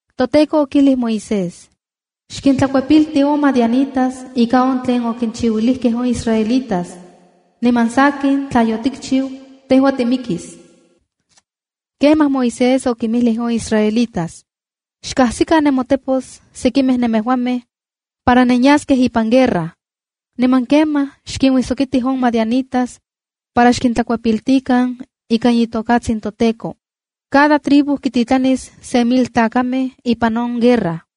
ToTEKO okijlij Moisés: “Xkintlakuepilti on madianitas ika on tlen okinchiuilijkej on israelitas. Niman sakin, tla yotikchiu, tejua timikis.” Kemaj Moisés okinmijlij on israelitas: —Xkajsikan nemotepos sekimej nemejuamej para nenyaskej ipan guerra. Niman kemaj xkinuijsokitij on madianitas para xkintlakuepiltikan ikan itokatsin toTEKO. Cada tribu kititlanis se mil tlakamej ipan on guerra.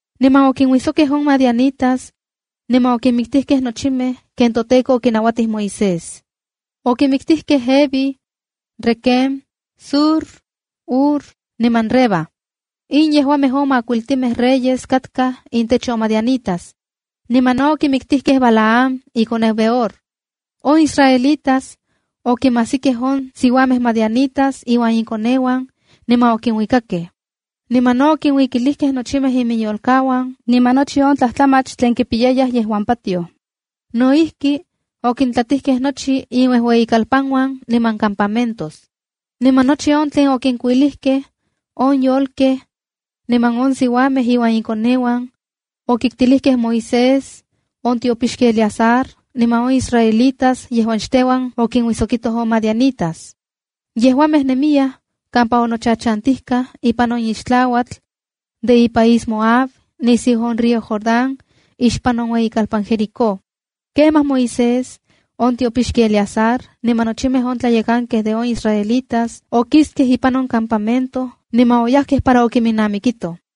Niman okinuijsokkej on madianitas niman okinmiktijkej nochimej ken toTEKO okinauatij Moisés. Okimiktijkej Evi, Requem, Zur, Hur niman Reba. In yejuamej on makuiltimej reyes katkaj intech on madianitas. Niman no okimiktijkej Balaam, ikoneu Beor. On israelitas okinmajsikej on siuamej madianitas iuan inkoneuan, niman okinuikakej. Niman no okinkuilijkej nochimej iminyolkauan, niman nochi on tlajtlamach tlen kipiyayaj yejuan patioj. No ijki, okintlatijkej nochi inuejueyikalpanuan niman campamentos. Niman nochi on tlen okinkuilijkej, on yolkej, niman on siuamej iuan inkoneuan, okiktilijkej Moisés, on tiopixki Eleazar niman on israelitas yejuan xteuan okinuijsokitoj on madianitas. Yejuamej nemiyaj kampa onochachantijkaj ipan on ixtlauatl de ipaís Moab, nisiu on río Jordán, ixpan on ueyikalpan Jericó. Kemaj Moisés, on tiopixki Eleazar, niman nochimej on tlayekankej de on israelitas, okiskej ipan on campamento niman oyajkej para okiminnamikitoj.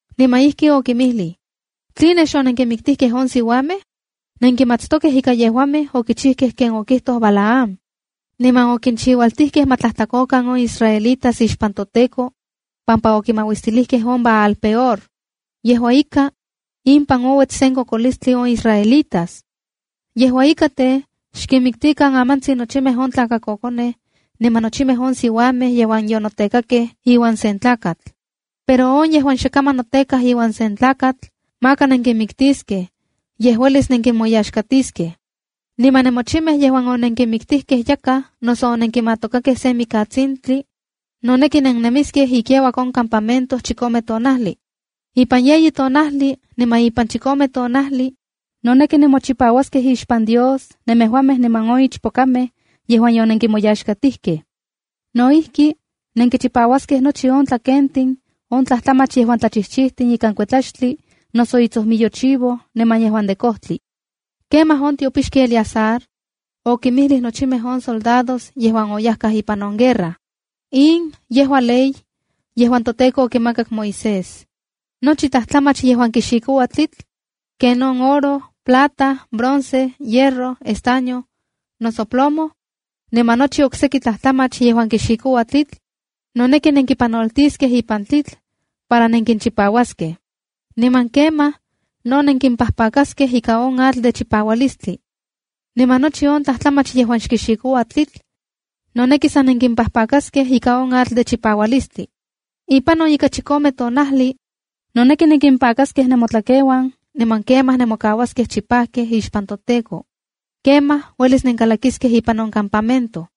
Niman ijkin okinmijlij: —¿Tline xonenkinmiktijkej on siuamej? Nenkimatstokej ika yejuamej okijchijkej ken okijtoj Balaam, niman okinchiualtijkej ma tlajtlakokan on israelitas ixpan toTEKO pampa okimauistilijkej on Baal-peor. Yejua ika, impan ouets sen kokolistli on israelitas. Yejua ika tej, xkinmiktikan amantsin nochimej on tlakakokonej niman nochimej on siuamej yejuan yonotekakej iuan sen tlakatl. Pero on yejuan xe kaman notekaj iuan sen tlakatl maka nenkinmiktiskej, yej uelis nenkinmoyaxkatiskej. Niman nemochimej yejuan onenkimiktijkej yakaj noso onenkimatokakej sen mikatsintli, noneki nennemiskej ikiauak on campamento chikome tonajli. Ipan yeyi tonajli niman ipan chikome tonajli, noneki nemochipauaskej ixpan Dios, nemejuamej niman on ichpokamej yejuan yonenkinmoyaxkatijkej. No ijki, nenkichipauaskej nochi on tlakentin, on tlajtlamach yejuan tlachijchijtin ikan kuetlaxtli, noso itsojmiyo chivo, niman yejuan de kojtli. Kemaj on tiopixki Eleazar okinmijlij nochimej on soldados yejuan oyajkaj ipan on guerra: —In yejua ley yejuan toTEKO okimakak Moisés: Nochi tlajtlamach yejuan kixikoua tlitl, ken on oro, plata, bronce, hierro, estaño, noso plomo, niman nochi okseki tlajtlamach yejuan kixikoua tlitl, noneki nenkipanoltiskej ipan tlitl para nenkinchipauaskej. Niman kemaj no nenkimpajpakaskej ika on atl de chipaualistli. Niman nochi on tlajtlamach yejuan xkixikoua tlitl, noneki san nenkimpajpakaskej ika on atl de chipaualistli. Ipan on ika chikome tonajli, noneki nenkimpakaskej nemotlakeuan, niman kemaj nemokauaskej chipajkej ixpan toTEKO. Kemaj uelis nenkalakiskej ipan on campamento.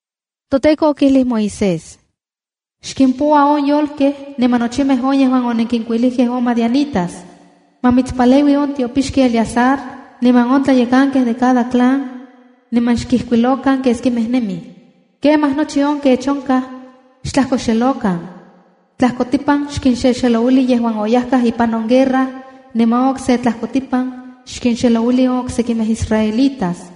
ToTEKO okijlij Moisés: “Xkimpoua on yolkej, niman nochimej on yejuan onenkinkuilijkej on madianitas. Ma mitspaleui on tiopixki Eleazar niman on tlayekankej de cada clan, niman xkijkuilokan keskimej nemij. Kemaj nochi on kech onkaj, xtlajkoxelokan. Tlajkotipan xkinxexelouili yejuan oyajkaj ipan on nouijsokilistli, niman on okse tlajkotipan xkinxexelouili on oksekimej israelitas.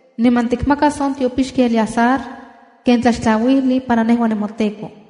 Niman tikmakas on tiopixki Eleazar ken tlaxtlauijli para nejua, nemoTEKO.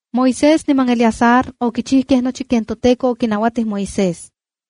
Moisés niman Eleazar okichijkej nochi ken toTEKO okinauatij Moisés.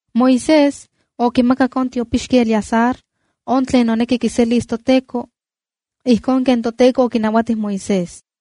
Moisés okimakak on tiopixki Eleazar, on tlen noneki kiselis toTEKO, ijkon ken toTEKO okinauatij Moisés.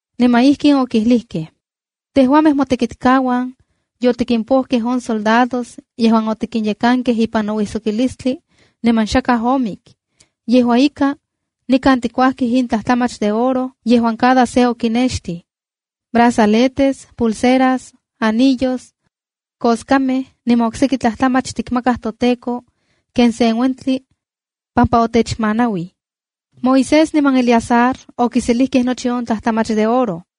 Niman ijkin okijlijkej: “Tejuamej, motekitkauan yotikimpojkej on soldados yejuan otikinyekankej ipan nouijsokilistli, niman xakaj omik. Yejua ika, nikan tikuajkij in tlajtlamach de oro yejuan cada se okinextij: makoskamej, pulseras, anillos, pipiloltin, koskamej, niman okseki tlajtlamach tikmakaj toTEKO, ken sen uentli pampa otechmanauij.” Moisés niman Eleazar okiselijkej nochi on tlajtlamach de oro.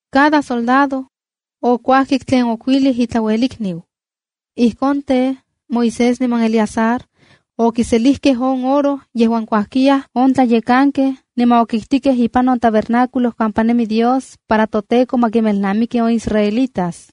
Cada soldado okuajkik tlen okuilij itlauelikniu. Ijkon tej, Moisés niman Eleazar okiselijkej on oro yejuan kuajkiyaj on tlayekankej, niman okiktikej ipan on tabernáculo kampa nemi Dios, para toTEKO ma kinmelnamiki on israelitas.